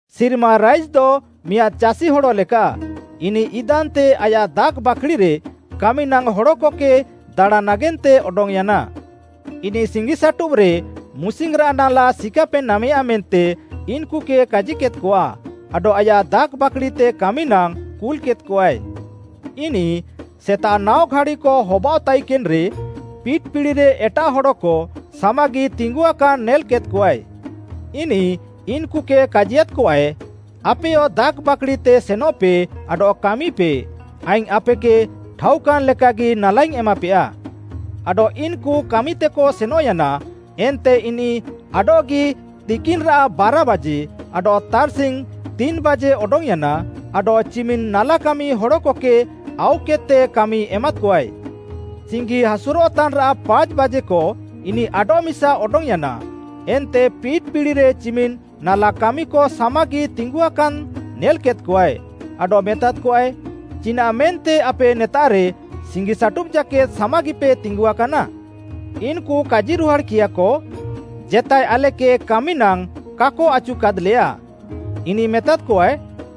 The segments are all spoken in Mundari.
“ସିର୍ମା ରାଇଜ୍‌ଦ ମିଆଁଦ୍‌ ଚାଷି ହଡ଼ଲେକାଃ, ଇନିଃ ଇଦାନ୍‌ତେ ଆୟାଃ ଦାଖ୍‌ବାକ୍‌ଡ଼ିରେ କାମିନାଙ୍ଗ୍‌ ହଡ଼କକେ ଦାଣାଁଁ ନାଗେନ୍ତେ ଅଡଙ୍ଗ୍‌ୟାନା। ଇନିଃ ସିଙ୍ଗିସାଟୁବ୍‌ରେ ମୁସିଙ୍ଗ୍‌ରାଃ ନାଲା ସିକାପେ ନାମେୟା ମେନ୍ତେ ଇନ୍‌କୁକେ କାଜିକେଦ୍‌କଆ, ଆଡଃ ଆୟାଃ ଦାଖ୍‌ବାକ୍‌ଡ଼ିତେ କାମିନାଙ୍ଗ୍‌ କୁଲ୍‌କେଦ୍‌କଆଏ। ଇନିଃ ସେତାଃ ନାଅ ଘାଡ଼ିକ ହବାଅଃତାଇକେନ୍‌ରେ ପିଟ୍‌ ପିଡ଼ିରେ ଏଟାଃ ହଡ଼କ ସାମାଗି ତିଙ୍ଗୁଆକାନ୍‌ ନେଲ୍‌କେଦ୍‌କଆଏ। ଇନିଃ ଇନ୍‌କୁକେ କାଜିୟାଦ୍‍କଆଏ, ‘ଆପେୟ ଦାଖ୍‌ବାକ୍‌ଡ଼ିତେ ସେନଃପେ ଆଡଃ କାମିପେ, ଆଇଙ୍ଗ୍‌ ଆପେକେ ଠାଉକାନ୍‌ ଲେକାଗି ନାଲାଇଙ୍ଗ୍‌ ଏମାପେୟା।’ ଆଡଃ ଇନ୍‌କୁ କାମିତେକ ସେନଃୟାନା, ଏନ୍ତେ ଇନିଃ ଆଡଃଗି ତିକିନ୍‌ରାଃ ବାରାବାଜେ ଆଡଃ ତାର୍‌ସିଙ୍ଗ୍‌ ତିନ୍‌ବାଜେ ଅଡଙ୍ଗ୍‌ୟାନା ଆଡଃ ଚିମିନ୍‌ ନାଲାକାମି ହଡ଼କକେ ଆଉକେଦ୍‌ତେ କାମି ଏମାଦ୍‌କଆଏ। ସିଙ୍ଗି ହାସୁରଃତାନ୍‌ରାଃ ପାଞ୍ଚ୍‌ବାଜେକ ଇନିଃ ଆଡଃମିସା ଅଡଙ୍ଗ୍‌ୟାନା, ଏନ୍ତେ ପିଟ୍‌ ପିଡ଼ିରେ ଚିମିନ୍‌ ନାଲାକାମିକ ସାମାଗି ତିଙ୍ଗୁଆକାନ୍‌ ନେଲ୍‌କେଦ୍‌କଆଏ, ଆଡଃ ମେତାଦ୍‌କଆଏ, ‘ଚିନାଃ ମେନ୍ତେ ଆପେ ନେତାଃରେ ସିଙ୍ଗିସାଟୁବ୍‌ ଜାକେଦ୍‌ ସାମାଗିପେ ତିଙ୍ଗୁଆକାନା?’ ଇନ୍‌କୁ କାଜିରୁହାଡ଼୍‌କିୟାକ, ‘ଜେତାଏ ଆଲେକେ କାମିନାଙ୍ଗ୍‌ କାକ ଆଚୁକାଦ୍‌ଲେୟା।’ ଇନିଃ ମେତାଦ୍‌କଆଏ,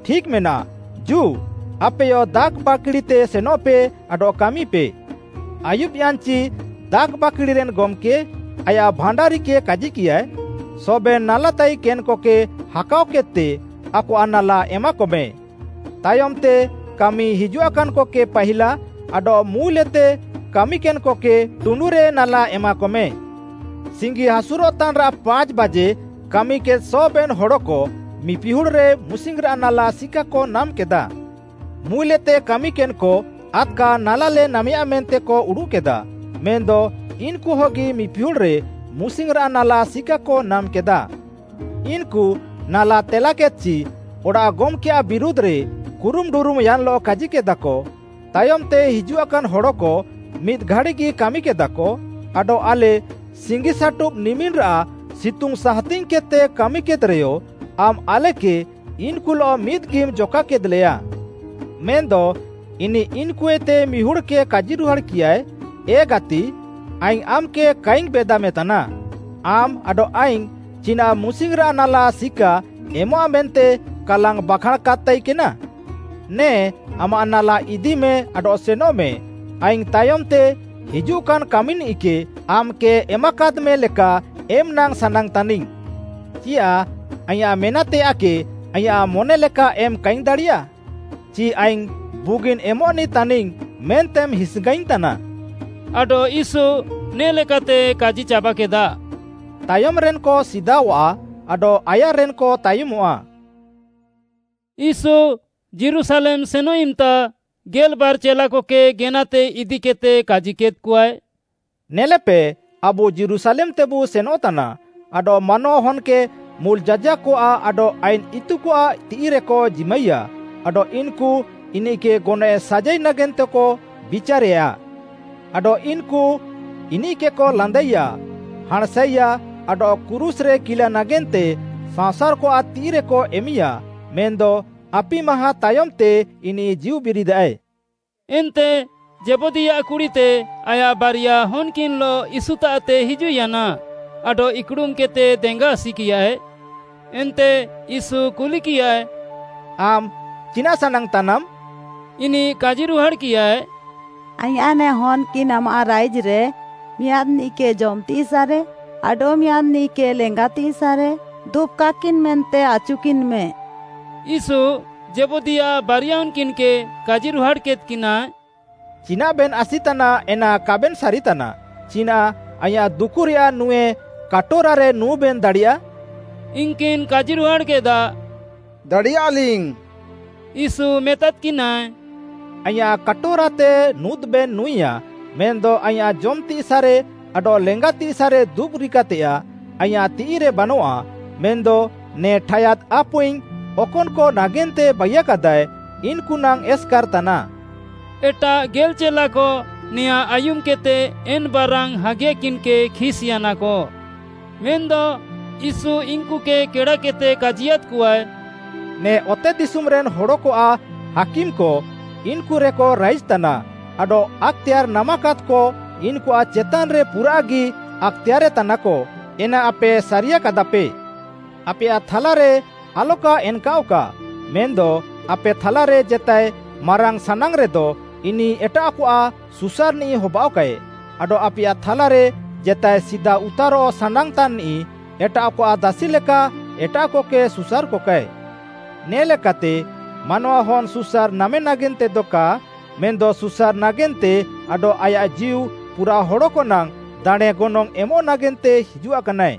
‘ଠିକ୍‌ମେନାଃ, ଜୁ, ଆପେୟ ଦାଖ୍‌ବାକ୍‌ଡ଼ିତେ ସେନଃପେ ଆଡଃ କାମିପେ।’ “ଆୟୁବ୍‌ୟାନ୍‍ଚି ଦାଖ୍‌ବାକ୍‌ଡ଼ିରେନ୍‌ ଗମ୍‌କେ, ଆୟାଃ ଭାଣ୍ଡାରିକେ କାଜିକିୟାଏ, ‘ସବେନ୍‌ ନାଲାତାଇକେନ୍‌କକେ ହାକାଅକେଦ୍‌ତେ ଆକଆଃ ନାଲା ଏମାକମେ।’ ତାୟମ୍‌ତେ କାମି ହିଜୁଆକାନ୍‌କକେ ପାହିଲା ଆଡଃ ମୁଲ୍‌ଏତେ କାମିକେନ୍‌କକେ ଟୁଣ୍ଡୁରେ ନାଲା ଏମାକମେ। ସିଙ୍ଗିହାସୁର୍‌ତାନ୍‌ରାଃ ପାଞ୍ଚ୍‌ବାଜେ କାମିକେଦ୍‌ ସବେନ୍‌ ହଡ଼କ ମିପିହୁଡ଼୍‌ରେ ମୁସିଙ୍ଗ୍‌ରାଃ ନାଲା ସିକାକ ନାମ୍‌କେଦା। ମୁଲ୍‌ଏତେ କାମିକେନ୍‌କ ଆଦ୍‌କା ନାଲାଲେ ନାମେୟା ମେନ୍ତେକ ଉଡ଼ୁଃକେଦା, ମେନ୍‌ଦ ଇନ୍‌କୁହଗି ମିପିହୁଡ଼୍‌ରେ ମୁସିଙ୍ଗ୍‌ରାଃ ନାଲା ସିକାକ ନାମ୍‌କେଦା। ଇନ୍‌କୁ ନାଲା ତେଲାକେଦ୍‌ଚି, ଅଡ଼ାଃ ଗମ୍‌କେୟାଃ ବିରୁଧ୍‌ରେ କୁରୁମ୍‌ଡୁରୁମ୍‌ୟାନ୍‌ଲଃ କାଜିକେଦାକ, ‘ତାୟମ୍‌ତେ ହିଜୁଆକାନ୍‌ ହଡ଼କ ମିଦ୍‌ ଘାଡ଼ିଗି କାମିକେଦାକ ଆଡଃ ଆଲେ ସିଙ୍ଗିସାଟୁବ୍‌ ନିମିନ୍‌ରାଃ ସିତୁଙ୍ଗ୍‌ ସାହାତିଙ୍ଗ୍‌କେଦ୍‌ତେ କାମିକେଦ୍‌ରେୟ ଆମ୍‌ ଆଲେକେ ଇନ୍‌କୁଲଃ ମିଦ୍‌ଗିମ୍‌ ଜକାକେଦ୍‌ଲେୟା।’ “ମେନ୍‌ଦ ଇନିଃ ଇନ୍‌କୁଏତେ ମିହୁଡ଼୍‌କେ କାଜିରୁହାଡ଼୍‌କିୟାଏ, ‘ଏ ଗାତି, ଆଇଙ୍ଗ୍‌ ଆମ୍‌କେ କାଇଙ୍ଗ୍‌ ବେଦାମେତାନା, ଆମ୍‌ ଆଡଃ ଆଇଙ୍ଗ୍‌ ଚିନାଃ ମୁସିଙ୍ଗ୍‌ରାଃ ନାଲା ସିକା ଏମଃଆ ମେନ୍ତେ କାଲାଙ୍ଗ୍‌ ବାଖାଁଣ୍‌ କାଦ୍‌ତାଇକେନା? ନେ ଆମାଃ ନାଲା ଇଦିମେ ଆଡଃ ସେନଃମେ। ଆଇଙ୍ଗ୍‌ ତାୟମ୍‌ତେ ହିଜୁଃକାନ୍‌ କାମିନିଃକେ ଆମ୍‌କେ ଏମାକାଦ୍‌ମେ ଲେକା ଏମ୍‌ନାଙ୍ଗ୍‌ ସାନାଙ୍ଗ୍‌ତାନାଇଙ୍ଗ୍‌। ଚିୟାଃ ଆଇଁୟାଃ ମେନାଃତେୟାଃକେ ଆଇଁୟାଃ ମନେଲେକା ଏମ୍‌ କାଇଙ୍ଗ୍‌ ଦାଡ଼ିୟା? ଚି ଆଇଙ୍ଗ୍‌ ବୁଗିନ୍‌ ଏମଃନିଃ ତାନିଙ୍ଗ୍‌ ମେନ୍ତେମ୍‌ ହିସ୍‌ଙ୍ଗାଇଙ୍ଗ୍‌ତାନା?’” ଆଡଃ ୟୀଶୁ ନେ ଲେକାତେ କାଜିଚାବାକେଦା, “ତାୟମ୍‌ରେନ୍‌କ ସିଦାଅଃଆ, ଆଡଃ ଆୟାର୍‌ରେନ୍‌କ ତାୟମଃଆ।” ୟୀଶୁ ଯୀରୁଶାଲେମ୍‌ ସେନଃ ଇମ୍‌ତା ଗେଲ୍‌ବାର୍‌ ଚେଲାକକେ ଗେନାତେ ଇଦିକେଦ୍‌ତେ କାଜିକେଦ୍‌କଆଏ, “ନେଲେପେ, ଆବୁ ଯୀରୁଶାଲେମ୍‌ତେବୁ ସେନଃତାନା ଆଡଃ ମାନୱାହନ୍‌କେ ମୁଲ୍‌ ଯାଜାକ୍‌କଆଃ ଆଡଃ ଆଇନ୍‌ ଇତୁକଆଃ ତିଃଇରେକ ଜିମାଇୟା ଆଡଃ ଇନ୍‌କୁ ଇନିଃକେ ଗନଏଃ ସାଜାଇ ନାଗେନ୍ତେକ ବିଚାରେୟା। ଆଡଃ ଇନ୍‌କୁ ଇନିଃକେକ ଲାନ୍ଦାଇୟା, ହାଁଣ୍‌ସାଇୟା ଆଡଃ କ୍ରୁଶ୍‌ରେ କିଲା ନାଗେନ୍ତେ ସାଅଁସାର୍‌କଆଃ ତିଃଇରେକ ଏମିୟା, ମେନ୍‌ଦ ଆପି ମାହାଁ ତାୟମ୍‌ତେ ଇନିଃ ଜୀଉବିରିଦାଏ।” ଏନ୍ତେ ଜେବଦୀୟାଃ କୁଡ଼ିତେ ଆୟାଃ ବାରିଆ ହନ୍‌କିନ୍‌ଲଃ ୟୀଶୁତାଃତେ ହିଜୁଃୟାନା ଆଡଃ ଇକ୍‌ଡ଼ୁମ୍‌କେଦ୍‌ତେ ଦେଙ୍ଗା ଆସିକିୟାଏ। ଏନ୍ତେ ୟୀଶୁ କୁଲିକିୟାଏ, “ଆମ୍‌ ଚିନାଃ ସାନାଙ୍ଗ୍‌ ତାନାମ୍‌?” ଇନିଃ କାଜିରୁହାଡ଼୍‌କିୟାଏ, “ଆଇଁୟାଃ ନେ ହନ୍‌କିନ୍‌ ଆମାଃ ରାଇଜ୍‌ରେ ମିଆଁଦ୍‌ନିଃକେ ଜମ୍‌ତିସାଃରେ ଆଡଃମିଆଁଦ୍‌ନିଃକେ ଲେଙ୍ଗାତିସାଃରେ ଦୁବ୍‌କାକିନ୍‌ ମେନ୍ତେ ଆଚୁକିନ୍‌ମେ।” ୟୀଶୁ ଜେବଦୀଆଃ ବାରିଆ ହନ୍‌କିନ୍‌କେ କାଜିରୁହାଡ଼୍‌କେଦ୍‌କିନାଏ, “ଚିନାଃବେନ୍‌ ଆସିତାନା ଏନା କାବେନ୍‌ ସାରିତାନା। ଚିନାଃ ଆଇଁୟାଃ ଦୁକୁରେୟାଃ ନୁଁଏ କାଟୋରାରେ ନୁଁବେନ୍‌ ଦାଡ଼ିୟା?” ଇନ୍‌କିନ୍‌ କାଜିରୁହାଡ଼୍‌କେଦା, “ଦାଡ଼ିୟାଲିଙ୍ଗ୍‌।” ୟୀଶୁ ମେତାଦ୍‌କିନାଏ, “ଆଇଁୟାଃ କାଟୋରାତେ ନୁଁଦବେନ୍‌ ନୁଁଇୟା ମେନ୍‌ଦ ଆଇଁୟାଃ ଜମ୍‌ତିସାଃରେ ଆଡଃ ଲେଙ୍ଗାତିସାଃରେ ଦୁବ୍‌ରିକାତେୟାଃ ଆଇଁୟାଃ ତିଃଇରେ ବାନଆଃ ମେନ୍‌ଦ ନେ ଠାୟାଦ୍‌ ଆପୁଇଙ୍ଗ୍‌ ଅକନ୍‌କ ନାଗେନ୍ତେ ବାଇୟାକାଦାଏ ଇନ୍‌କୁ ନାଙ୍ଗ୍‌ ଏସ୍‌କାର୍‌ ତାନାଃ।” ଏଟାଃ ଗେଲ୍‌ ଚେଲାକ ନେଆଁଁ ଆୟୁମ୍‌କେଦ୍‌ତେ ଏନ୍‌ ବାରାନ୍‌ ହାଗିୟାକିନ୍‌କେ ଖିସ୍‌ୟାନାକ। ମେନ୍‌ଦ ୟୀଶୁ ଇନ୍‌କୁକେ କେଡ଼ାକେଦ୍‌ତେ କାଜିୟାଦ୍‌କଆଏ, “ନେ ଅତେଦିଶୁମ୍‌ରେନ୍‌ ହଡ଼କଆଃ ହାକିମ୍‌କ ଇନ୍‌କୁରେକ ରାଇଜ୍‌ତାନା ଆଡଃ ଆକ୍‌ତେୟାର୍‌ ନାମାକାଦ୍‌କ ଇନ୍‌କୁଆଃ ଚେତାନ୍‌ରେ ପୁରାଃଗି ଆକ୍‌ତେୟାର୍‌ରେ ତାନାକ, ଏନା ଆପେ ସାରିୟାକାଦାଃପେ। ଆପେୟାଃ ଥାଲାରେ ଆଲକା ଏନ୍‌କାଅଃକା, ମେନ୍‌ଦ ଆପେ ଥାଲାରେ ଜେତାଏ ମାରାଙ୍ଗ୍‌ ସାନାଙ୍ଗ୍‌ରେଦ ଇନିଃ ଏଟାଃକଆଃ ସୁସାର୍‌ନିଃ ହବାଅଃକାଏ, ଆଡଃ ଆପେୟାଃ ଥାଲାରେ ଜେତାଏ ସିଦାଉତାରଃ ସାନାଙ୍ଗ୍‌ତାନ୍‌ନିଃ, ଏଟାଃକଆଃ ଦାସିଲେକା ଏଟାଃକକେ ସୁସାର୍‌କକାଏ। ନେ ଲେକାତେ ମାନୱାହନ୍‌ ସୁସାର୍‌ ନାମେ ନାଗେନ୍ତେଦ କା ମେନ୍‌ଦ ସୁସାର୍‌ ନାଗେନ୍ତେ ଆଡଃ ଆୟାଃ ଜୀଉ ପୁରାଃ ହଡ଼କନାଙ୍ଗ୍‌ ଦାଣେଁ ଗନଙ୍ଗ୍‌ ଏମ୍‌ ନାଗେନ୍ତେ ହିଜୁଆକାନାଏ।”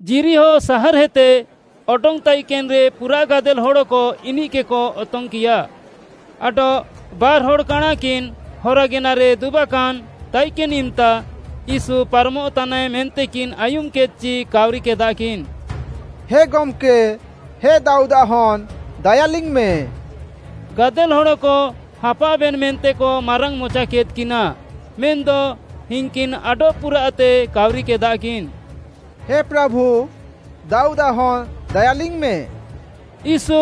ଯିରିହୋ ସାହାର୍‌ଏତେ ଅଡଙ୍ଗ୍‌ ତାଇକେନ୍‌ରେ ପୁରାଃ ଗାଦେଲ୍‌ ହଡ଼କ ଇନିଃକେକ ଅତଙ୍ଗ୍‌କିୟା। ଆଡଃ ବାର୍‌ହଡ଼୍‌ କାଣାଁକିନ୍‌ ହରାଗେନାରେ ଦୁବାକାନ୍‌ ତାଇକେନ୍‌ ଇମ୍‌ତା ୟୀଶୁ ପାରମଃତାନାଏ ମେନ୍ତେକିନ୍‌ ଆୟୁମ୍‌କେଦ୍‌ଚି କାଉରିକେଦାକିନ୍‌, “ହେ ଗମ୍‌କେ, ହେ ଦାଉଦ୍‌ଆଃ ହନ୍‌, ଦାୟାଲିଙ୍ଗ୍‌ମେ।” ଗାଦେଲ୍‌ ହଡ଼କ ହାପାଃଅବେନ୍‌ ମେନ୍ତେକ ମାରାଙ୍ଗ୍‌ମଚାକେଦ୍‍କିନା ମେନ୍‌ଦ ଇନ୍‌କିନ୍‌ ଆଡଃ ପୁରାଃତେ କାଉରିକେଦାକିନ୍‌, “ହେ ପ୍ରାଭୁ, ଦାଉଦ୍‌ଆଃ ହନ୍‌ ଦାୟାଲିଙ୍ଗ୍‌ମେ!” ୟୀଶୁ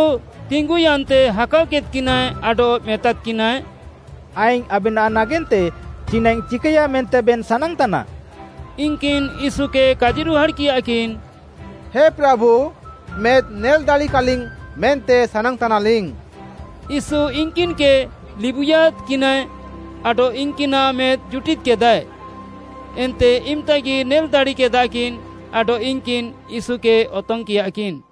ତିଙ୍ଗୁୟାନ୍ତେ ହାକାଅକେଦ୍‌କିନାଏ ଆଡଃ ମେତାଦ୍‌କିନାଏ, “ଆଇଙ୍ଗ୍‌ ଆବେନାଃ ନାଗେନ୍ତେ ଚିନାଃଇଙ୍ଗ୍‌ ଚିକାୟା ମେନ୍ତେବେନ୍‌ ସାନାଙ୍ଗ୍‌ତାନା?” ଇନ୍‌କିନ୍‌ ୟୀଶୁକେ କାଜିରୁହାଡ଼୍‌କିୟାକିନ୍‌, “ହେ ପ୍ରାଭୁ, ମେଦ୍‌ଲିଙ୍ଗ୍‌ ନେଲ୍‌ ଦାଡ଼ିକା ମେନ୍ତେଲିଙ୍ଗ୍‌ ସାନାଙ୍ଗ୍‌ତାନା।” ୟୀଶୁ ଇନ୍‌କିନ୍‌କେ ଲିବୁଇୟାଦ୍‌କିନାଏ ଆଡଃ ଇନ୍‌କିନାଃ ମେଦ୍‌ ଜୁଟିଦ୍‌କେଦାଏ, ଏନ୍ତେ ଇମ୍‌ତାଗି ନେଲ୍‌ ଦାଡ଼ିକେଦାକିନ୍‌ ଆଡଃ ଇନ୍‌କିନ୍‌ ୟୀଶୁକେ ଅତଙ୍ଗ୍‌କିୟାକିନ୍‌।